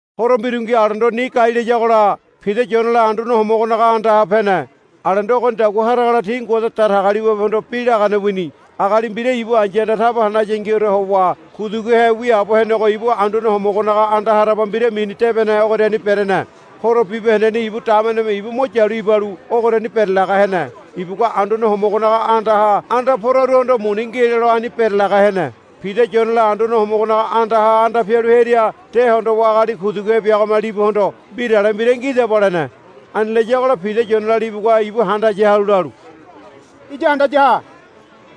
Horo mbirungi alendo ni gai layagola Pida Yonela Anduane Homogonaga andaha pene. Alendo ogonidagua haragola ti Ngode Datagaliwabehondo bi lagane wini. Agali mbira ibu ai̱yahanda taba hanayangiore howa kuduguhe wiaabo henego ibu Anduane Homogonaga anda haraba mbira mini Debene ogoriani berene. Horo bibahendeni ibu dameneme ibu mo yalu ibalu ogoriani berelaga hene. Ibugua Anduane Homogonaga andaha anda poraruhondo, Muni ngi, lelo ani berelaga hene. Pida Yonela Anduane Homogonaga andaha anda pialu hearia de hondowa agali kuduguhe biagome libuhondo, Mbirale mbira ngidaba, lene. Ani layagola Pida Yonela libugua ibu handaya halu lalu, Iya handaya ha,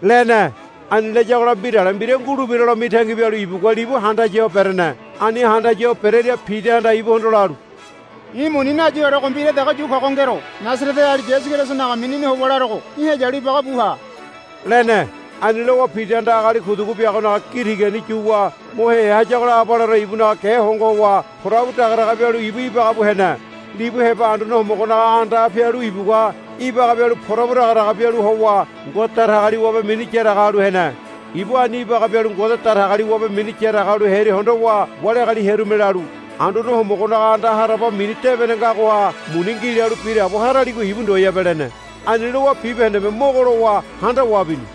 lene. Ani layagola mbirale mbira ngulebiralo mitangi bialu ibugua libu handaya ho berene. Ani handaya ho bereria Pidahanda ibuhondo lalu, I̱ muni nayiorego mbira dege yu kogo ngero. Nasareteali Yasu Kerisonaga minini howa larogo í̠ heyalu ibagabu ha, lene. Ani lowa Pidahanda agali kudugu biagonaga gi tigani yuwa mo heya hayagola abaleore ibunaga ge hongo howa porabu dagadaga bialu ibu ibagabu hene. Libu heba Anduane Homogonaga andaha pialu ibugua ibaga bialu porabu dagadaga bialu howa Ngode Datagaliwabe mini yaraga halu hene. Ibu ani ibaga bialu Ngode Datagaliwabe mini yaraga halu hearia hondowa wali agali hearume lalu, Anduane Homogonaga anda haraba mini Debene ngagoha muni ngi lalu biraabo haraligo ibu ndoyabe, lene. Ani lowa bibahendeme mogo lowa handawa bini.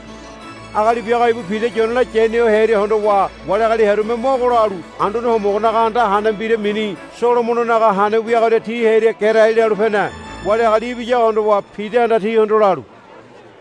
Agali biago ibu Pida Yonela yaniho hearia hondowa wali agali hearume mogo lalu Anduane Homogonaga anda hane mbira mini Solomononaga Hane wiagoria ti hearia gerai lalu pene. Wali agali ibiyago hondowa Pidahanda tihondo lalu,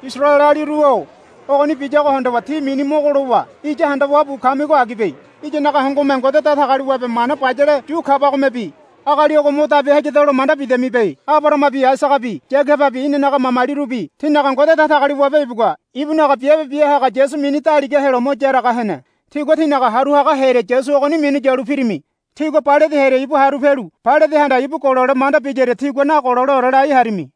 Isaraelealiru-o ogoni biyago hondowa tí mini mogo lowa iya handawa bu kamigo agibe. Iyanaga hongome Ngode Datagaliwabe mana bayale yu kabagomebi agali ogo mo dabi hayadalo manda bidamibe. Abarahamabi Aisagabi Yagababi inanaga mamalirubi tinaga Ngode Datagaliwabe ibugua ibunaga biabe biahaga Yasu mini daliga helo mo yaraga hene. Tígua tínaga haru haga hearia Yasu ogoni minu yalu pirimi. Tígua Pailate hearia ibu haru pialu Pailatehanda ibu golole manda biyaria tígua nagololeore lai harimi.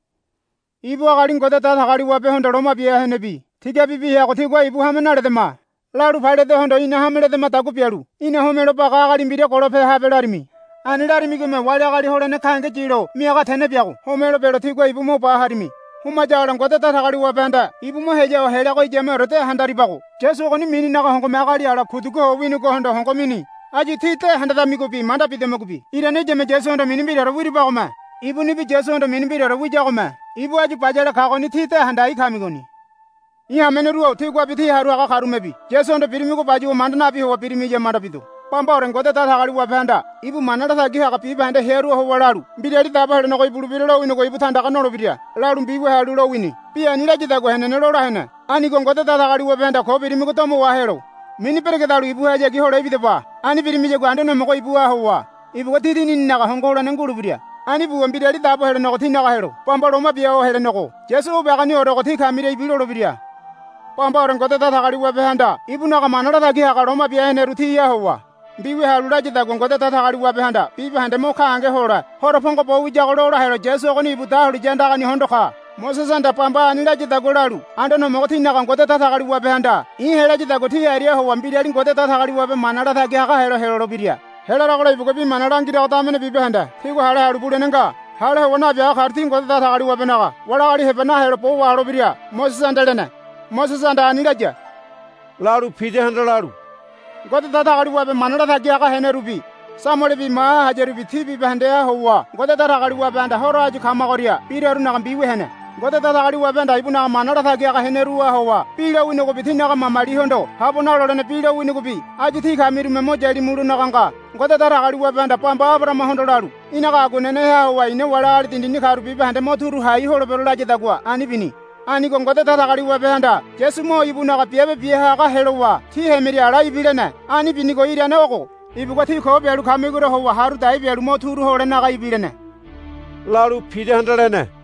Ibu agali Ngode Datagaliwabehondo loma bia henebi tigabibi heago tígua, Ibu hame naledama, lalu Pailatehondo, Ina hame ledamadagua bialu í̠na homelo baga agali mbira golope habe, larimi. Ani larimigome wali agali holene gahenge yilo miaga tene biago homelo belo tígua mo ba harimi. Homayagola Ngode Datagaliwabehanda ibu mo heya ho heleago iyameore de handaribago. Yasu ogoni mininaga hongome agali ala kudugu ho wini ogohondo hongo mini. Áyu tí de hendedamigobi manda bidamigobi irane iyame Yasuhondo mini mbiraore wiribagome. Ibunibi Yasuhondo mini mbiraore wiyagome ibu áyu bayale kagoni tí de handai kamigoni. I̱ hameneru-o tíguabi tí haru haga karumebi Yasuhondo birimigo bayuwa manda nabi howa birimiya manda bido. Bambaore Ngode Datagaliwabehanda ibu mana latagi haga bibahende hearuha howa lalu, Mbirali Dabo Helenego ibulebira lowinigo ibu tandaga nolebira, lalu mbiwia halu lowini. Bi ani layadagua henene lola hene. Anigo Ngode Datagaliwabehanda ko birimigo domo wahelo mini beregedalu ibuhayagi hole ibidaba. Ani birimiyagua Anduane Homogo ibuha howa ibugua tí dinininaga hongo holene ngulebira. Ani buwa Mbirali Dabo Helenego tínaga helo bamba loma bia ho helenego Yasu o biagoniorego tí kamiria ibilolebira. Bambaore Ngode Datagaliwabehanda ibunaga mana latagi haga loma bia heneru tiha howa mbiwia halu layadagua Ngode Datagaliwabehanda bibahende mo gahenge hole horo pongo bo wiyago lola helo Yasu ogoni ibu dahuliya andagani hondo ka. Mosesehanda bamba ani layadagua lalu, Anduane Homogo tínaga Ngode Datagaliwabehanda i̱ helayadagua tí ariaha howa mbirali Ngode Datagaliwabe mana latagi haga helo helolebira. Helaragola ibugua bi mana langirago damene bibahende tígua hale halu bulene nga. Hale howa nabiaga karu ti Ngode Datagaliwabenaga wali agali heba nahelo bo waholebira, Mosesehanda lene. Mosesehanda ani laya, lalu Pidahanda lalu, Ngode Datagaliwabe mana latagi haga henerubi Samuelebi maha hayarubi ti bibahendeha howa Ngode Datagaliwabehanda horo áyu kamagoria birarunaga mbiwia hene. Ngode Datagaliwabehanda ibunaga mana latagi haga heneruha howa bi lowinigobi tínaga mamalihondo habo nalolene bi lowinigobi áyu tí kamirume mo yalimulonaga nga. Ngode Datagaliwabehanda bamba Abarahamahondo lalu, Í̠naga aguaneneha howa i̱na wali agali dindini karu bibahende mo turu hai holebero, layadagua ani bini. Anigo Ngode Datagaliwabehanda Yasu mo ibunaga Biabe Bia Haga helowa tí hemiria ala ibilene. Ani binigo irane ogo. Ibugua tí ko bialu kamigoria howa haru dai bialu mo turu holenaga ibilene, lalu Pidahanda lene.